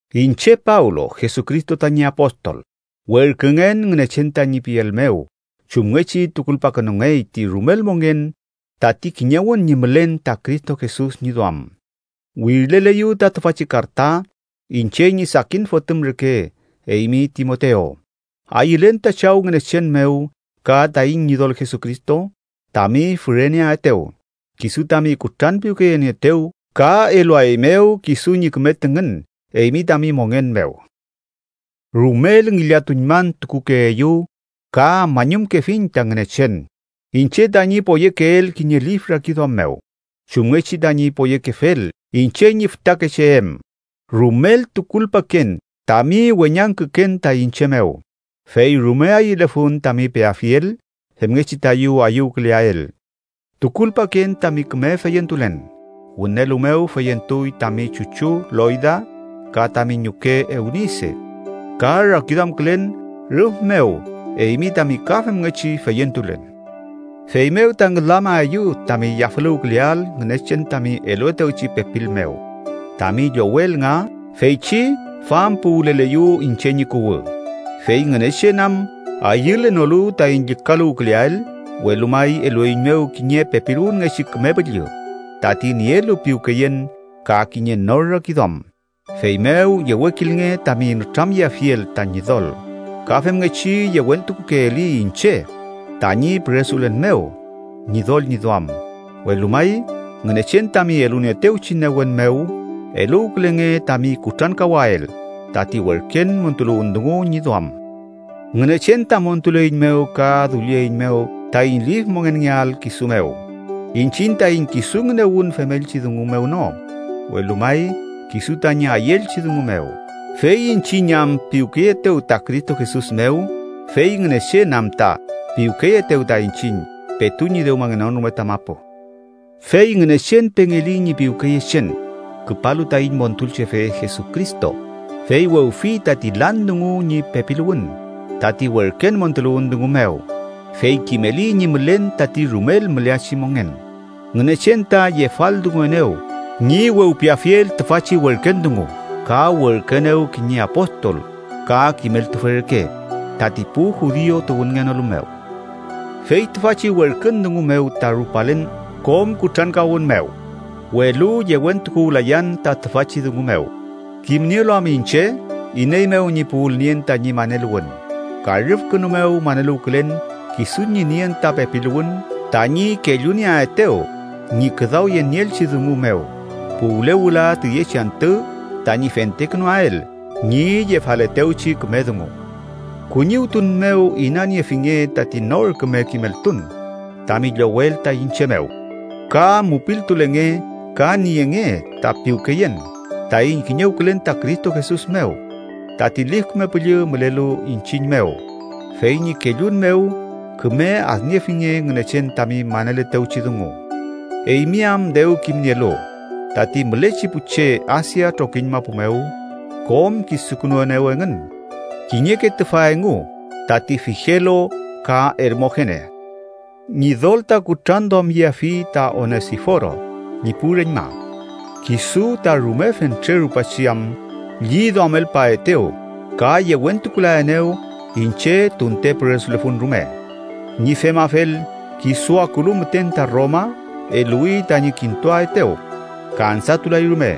Iñche Pablo, Jesucristo tañi apostol, werküngen Ngünechen tañi piel mew chumngechi tukulpakünungey ti rumel mongen tati kiñewün ñi mülen ta Cristo Jesus ñi duam, wirileleyu ta tüfachi karta, iñche ñi sakin fotüm reke, eymi Timotew. Ayülen ta Chaw Ngünechen mew ka taiñ Ñidol Jesucristo tami füreneaetew, kisu tami kutranpiwkeyenieetew ka eluaeymew kisu ñi küme tüngün eymi tami mongen mew. Rumel ngillatuñmantukukeeyu ka mañumkefiñ ta Ngünechen, iñche tañi poyekeel kiñe lif rakiduam mew, chumngechi tañi poyekefel iñche ñi fütakeche em. Rumel tukulpaken tami weñangküken ta iñche mew, fey rume ayülefun tami peafiel femngechi tayu ayüwküleael. Tukulpaken tami küme feyentulen. Wünelu mew feyentuy tami chuchu Loyda ka tami ñuke Eunise, ka rakiduamkülen rüf mew eymi tami ka femngechi feyentulen. Feymew ta ngülamaeyu tami yafüluwküleael Ngünechen tami eluetewchi pepil mew tami llowel nga feychi fampuwüleleyu iñche ñi kuwü. Fey Ngünechen am ayülenolu taiñ llükaluwküleael, welu may elueiñmew kiñe pepiluwünngechi Küme Püllü, tati nielu piwkeyen ka kiñe nor rakiduam. Feymew yewekilnge tami nütramyeafiel ta Ñidol. Ka femngechi yewentukukeeli iñche tañi püresulen mew Ñidol ñi duam. Welu may, Ngünechen tami elunieetewchi newen mew, eluwkülenge tami kutrankawael tati werken montuluwün dungu ñi duam. Ngünechen ta montuleiñmew ka dullieiñmew taiñ lif mongenngeael kisu mew, iñchiñ taiñ kisu ngünewün femelchi dungu mew no, welu may kisu tañi ayüelchi dungu mew, fey iñchiñ am piwkeyeetew ta Cristo Jesus mew, fey Ngünechen am ta piwkeyeetew ta iñchiñ petu ñi dewmangenon rume ta mapu. Fey Ngünechen pengeli ñi piwkeyechen, küpalu taiñ Montulchefe Jesucristo, fey wewfi tati lan dungu ñi pepiluwün, tati werken montuluwün dungu mew, fey kimeli ñi mülen tati rumel müleachi mongen. Ngünechen ta yefaldunguenew ñi wewpiafiel tüfachi werken dungu, ka werküenew kiñe apostol ka kimeltufe reke tati pu judiu tuwünngenolu mew. Fey tüfachi werkün dungu mew ta rupalen kom kutrankawün mew. Welu yewentukuwlayan ta tüfachi dungu mew, kimnielu am iñche iney mew ñi puwülnien tañi maneluwün. Ka rüfkünu mew maneluwkülen kisu ñi nien ta pepiluwün tañi kellunieaetew ñi küdawyenieelchi dungu mew puwle wüla tüyechi antü tañi fentekünuael ñi yefaletewchi küme dungu. Kuñiwtun mew inaniefinge tati nor küme kimeltun tami llowel ta iñche mew, ka mupiltulenge ka nienge ta piwkeyen taiñ kiñewkülen ta Cristo Jesus mew. Tati Lif Küme Püllü mülelu iñchiñ mew, fey ñi kellun mew, küme adniefinge Ngünechen tami maneletewchi dungu. Eymi am dew kimnielu, tati mülechi pu che Asia trokiñ mapu mew kom kisukünuenew engün. Kiñeke tüfa engu tati, Figelo ka Ermogene. Ñidol ta kutranduamyeafi ta Onesiforo ñi pu reñma, kisu ta rume fentre rupachi am lliduamelpaetew ka yewentukulaenew iñche tunte püresulefun rume. Ñi femafel, kisu akulu müten ta Roma, eluwi tañi kintuaetew. Kansatulay rume,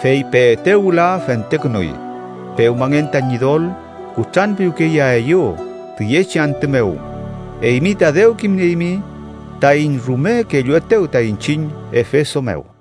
fey peetew wüla, fentekünuy. Pewmangen ta Ñidol kutranpiwkeyeaeyew tüyechi antü mew. Eymi ta dew kimnieymi taiñ rume kelluetew ta iñchiñ Efeso mew.